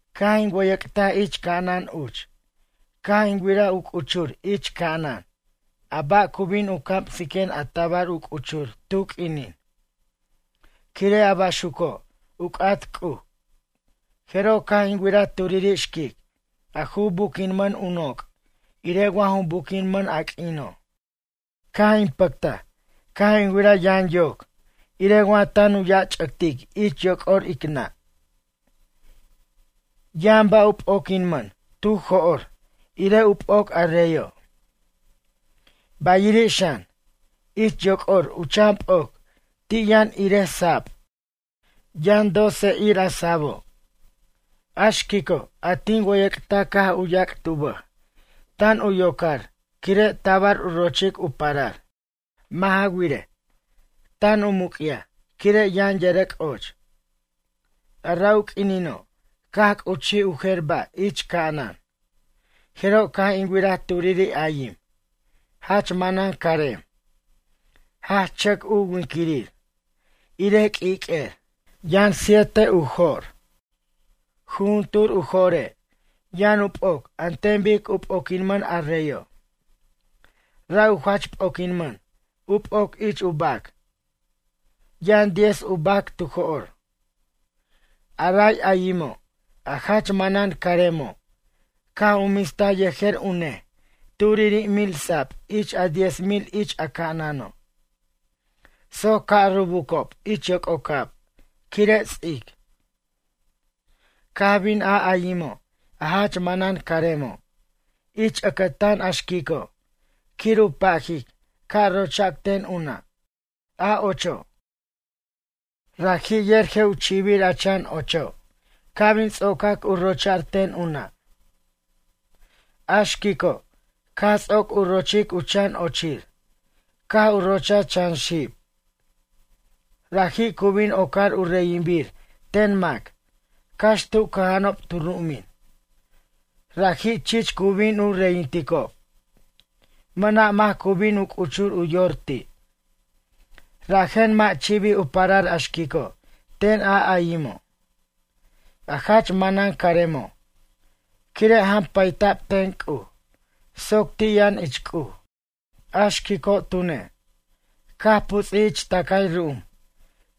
Caj in wʌyʌc'taj ich ca'anan uch, caj in wiraj u c'uchur ich ca'anan a ba' cu bin u camsiquen a tabar u c'uchur tu q'uinin, quire' a baxuco' u c'at C'uj. Jeroj caj in wiraj turiri' xquic a ju buquinman u noc' irej wa ju buquinmʌn a q'uino'. Caj in pʌctaj caj in wiraj yaran yoc irej wa tan u yach'ʌctic ich yoc'or ic nʌ'. Yʌn ba' u p'oquinmʌn tu jo'r irej u p'oc a reyo'. Bayiri' xan, ich yoc'or u chan p'oc ti' yʌn irej sab. Yʌn doce ir a sabo'. A xquico' a tin wʌyʌc'taj caj u yac't u bʌj, tan u yoc'ar quire' tabar u rochic u parar. Mʌ' ja wirej, tan u muc'yaj quire' yʌn yʌrʌc' och. A ra' u q'uinino', caj c'uchij u jer ba' ich ca'anan. Jeroj caj in wiraj turiri' ayim, jach manan carem, jach chʌc u winquirir irej q'uiq'uer. Yʌn siete u jo'r, jujuntur u jo're' yʌn u p'oc an ten bic u p'oquinmʌn a reyo'. Ra' u jach p'oquinmʌn u p'oc ich u bac. Yʌn diez u bac tu jo'r. A ray ayimo', a jach manan caremo', caj u mistaj yejer u nej turiri' mil sab ich a diez mil ich a ca'anano' soc ca' rubucob ich yoc'ocab quire' ts'ic. Caj bin a ayimo', a jach manan caremo', ich ʌcʌtan a xquico', quir u pajic ca' rochac ten u nʌ', a ocho'. Raji' yer je' u chi'bir a chan ocho' ca' bin ts'ocac u rocha'r ten u nʌ'. A xquico', caj ts'oc u rochic u chan ochir, caj u rochaj chan xib. Raji' cu bin ocar u reyinbir ten mac cax tu cʌja'anob tu ru'umin, raji' chich cu bin u reyinticob, mʌna' mac cu bin u c'uchur u yor ti'. Rajen mʌ' chi'bij u parar a xquico' ten a ayimo', a jach manan caremo', quire' jampayta'b ten C'uj soc ti' yʌn ich C'uj. A xquico' tune', caj puts'ij ich tʌcay ru'um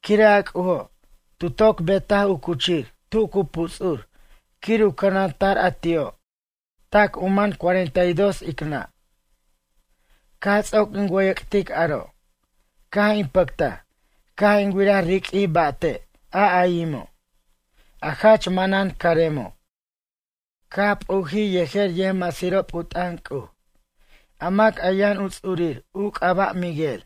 quire' a C'ujo' tu toc betaj u cuchir tu cu puts'ur quir u cʌnanta'r a ti'o' tac u man cuarenta y dos ic nʌ'. Caj ts'oc in wʌyʌc'tic aro', caj in pʌctaj caj in wiraj riq'uij ba'te' a ayimo', a jach manan caremo', caj p'ujij yejer yʌjmasirob u t'ʌn C'uj, a mac a yʌn u ts'uirir u c'aba' Miguel.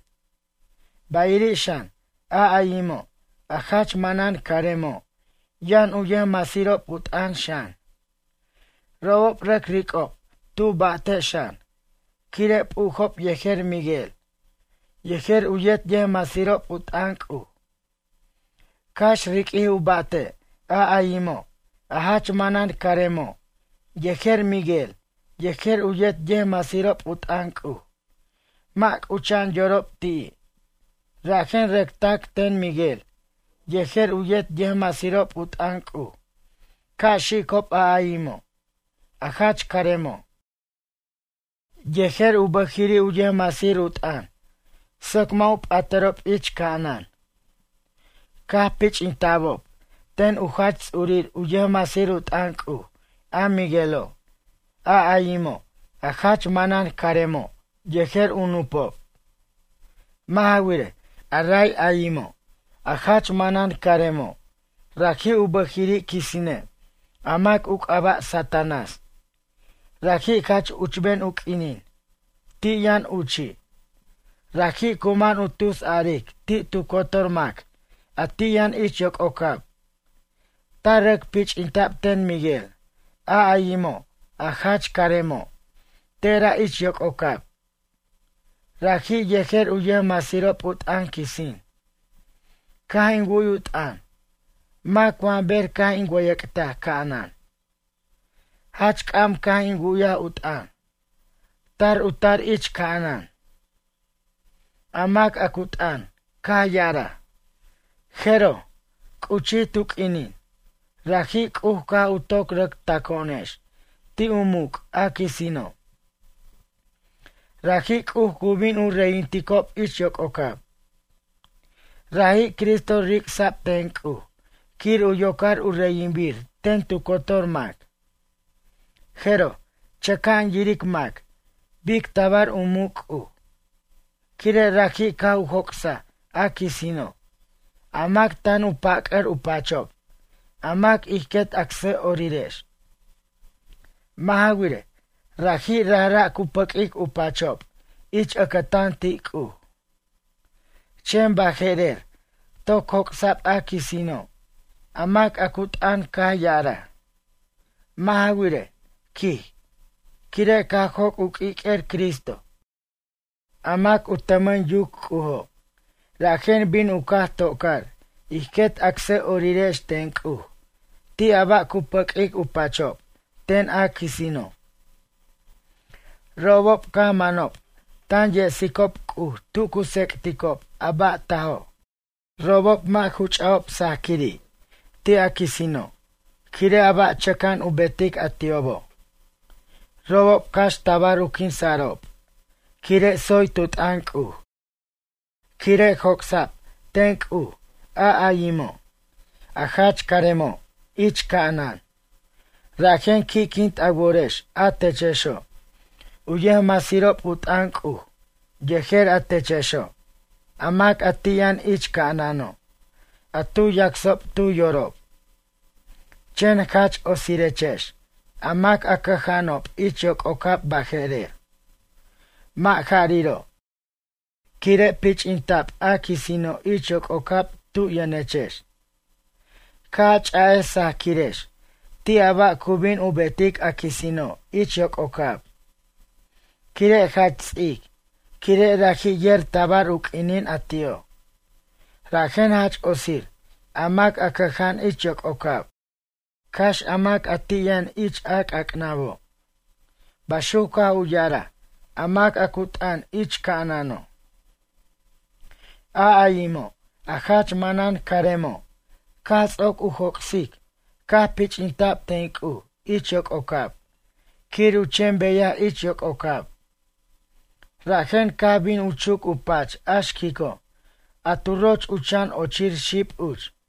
Bayiri' xan, a ayimo', a jach manan caremo' yʌn u yʌjmasirob u t'ʌn xan, robob rʌc ric'ob tu ba'te' xan, quire' p'ujob yejer Miguel yejer u yet yʌjmasirob u t'ʌn C'uj. Cax riq'uij u ba'te', a ayimo', a jach manan caremo', yejer Miguel yejer u yet yʌjmasirob u t'ʌn C'uj, mʌ' c'ucha'an yorob ti'i', rajen rʌc tac' ten Miguel yejer u yet yʌjmasirob u t'ʌn C'uj ca' xicob a ayimo', a jach caremo', yejer u bʌjiri' u yʌjmasir u t'ʌn soc mʌ' u p'atʌrob ich ca'anan. Caj pich'inta'bob ten u jach ts'urir u yʌjmasir u t'ʌn C'uj a Miguelo', a ayimo', a jach manan caremo' yejer u nupob. Mʌ' ja wirej, a ray ayimo', a jach manan caremo', raji' u bʌjiri' quisine' a mac u c'aba' Satanás, raji' jach uchben u q'uinin, ti' yʌn uchi'. Raji' cu man u tusaric ti' tu cotor mac a ti' yʌn ich yoc'ocab. Tar rʌc pich'inta'b ten Miguel, a ayimo', a jach caremo', tera' ich yoc'ocab, raji' yejer u yʌjmasirob u t'ʌn quisin. Caj in wu'y u t'ʌn mac wa ber caj in wʌyʌc'taj ca'anan. Jach c'am caj in wu'yaj u t'ʌn, tar u tar ich ca'anan. A mac a cu t'ʌn caj ya'araj: ―Jeroj, c'uchij tu q'uinin, raji' C'uj caj u toc rʌc taco'onex ti' u muc' a quisino'. Raji' C'uj cu bin u reyinticob ich yoc'ocab. Raji' Cristo ric'sa'b ten C'uj quir u yocar u reyinbir ten tu cotor mac. Jeroj, chʌca'an yiric mac bic tabar u muc' C'uj, quire' raji' caj u joc'saj a quisino', a mac tan u pac'ʌr u pachob a mac ij quet acsʌ'orirex. Mʌ' ja wirej, raji' rajra' cu pʌq'uic u pachob ich ʌcʌtan ti' C'uj. Chen baje'rer toc joc'sa'b a quisino'. A mac a cu t'ʌn caj ya'araj: ―Mʌ' ja wirej ―quij―, quire' caj joc' u q'uiq'uer Cristo, a mac u tʌmʌn yuc C'ujo', rajen bin u caj tocar ij quet acsʌ'orirex ten C'uj ti' a ba' cu pʌq'uic u pachob ten a quisino'. Robob caj manob tan yesicob C'uj tu cu tsec'ticob a ba' tajo'. Robob mʌ' ju ch'a'ob sajquiri' ti' a quisino', quire' a ba' chʌca'an u betic a ti'obo'. Robob cax tabar u quinsa'rob quire' tsoy tu t'ʌn C'uj. Quire' joc'sa'b ten C'uj a ayimo', a jach caremo', ich ca'anan, rajen qui'quint a worex a techexo', u yʌjmasirob u t'ʌn C'uj, yejer a techexo', a mac a ti' yʌn ich ca'anano' a tu yacsob tu yorob. Chen jach otsirechex a mac a cʌja'anob ich yoc'ocab baje'rer, mʌ' jariro', quire' pich'inta'b a quisino' ich yoc'ocab tu yʌnechex. Ca' a ch'a'ej sajquirex ti' a ba' cu bin u betic a quisino' ich yoc'ocab, quire' jach ts'ic, quire' raji' yer tabar u q'uinin a ti'o'. Rajen jach otsir a mac a cʌja'an ich yoc'ocab, cax a mac a ti' yʌn ich a c'ac'nabo' ―baxuc caj u ya'araj a mac a cu t'ʌn ich ca'anano'. A ayimo', a jach manan caremo', caj ts'oc u joc'sic, caj pich'inta'b ten C'uj ich yoc'ocab quir u chen beyaj ich yoc'ocab, rajen caj bin u chuc u pach a xquico', a tu roch u chan ochir xib uch.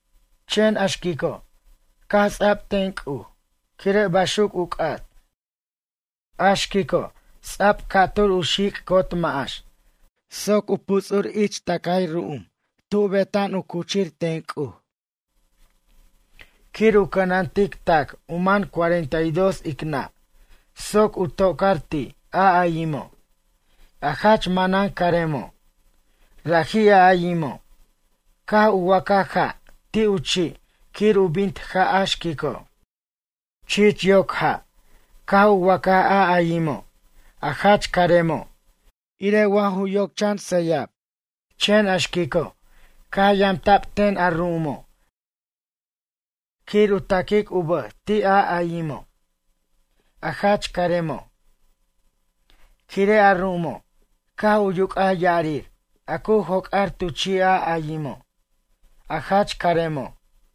Chen a xquico', caj ts'a'b ten C'uj, quire' baxuc u c'at. A xquico' ts'a'b ca'tur u xic' cot ma'ax soc u puts'ur ich tʌcay ru'um tub u beta'an u cuchir ten C'uj, quir u cʌnantic tac u man cuarenta y dos ic nʌ' soc u tocar ti' a ayimo', a jach manan caremo'. Raji' a ayimo', caj u wacaj ja' ti' u chi' quir u bint ja' a xquico'. Chich yoc ja' caj u wacaj a ayimo', a jach caremo', irej wa ju yoc chan sayab. Chen a xquico', caj yamta'b ten a ru'umo' quir u taquic u bʌj ti' a ayimo', a jach caremo'. Quire' a ru'umo' caj u yuc'aj ya'arir a cu joc'ar tu chi' a ayimo', a jach caremo'.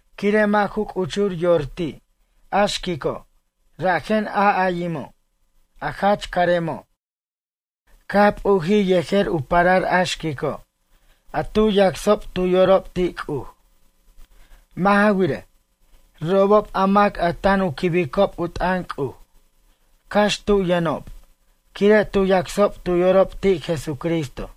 Quire' mʌ' ju c'uchur yor ti' a xquico', rajen a ayimo', a jach caremo', caj p'ujij yejer u parar a xquico', a tu yacsob tu yorob ti' C'uj. Mʌ' ja wirej, robob a mac a tan u quibicob u t'ʌn C'uj, cax tu yʌnob quire' tu yacsob tu yorob ti' Jesucristo.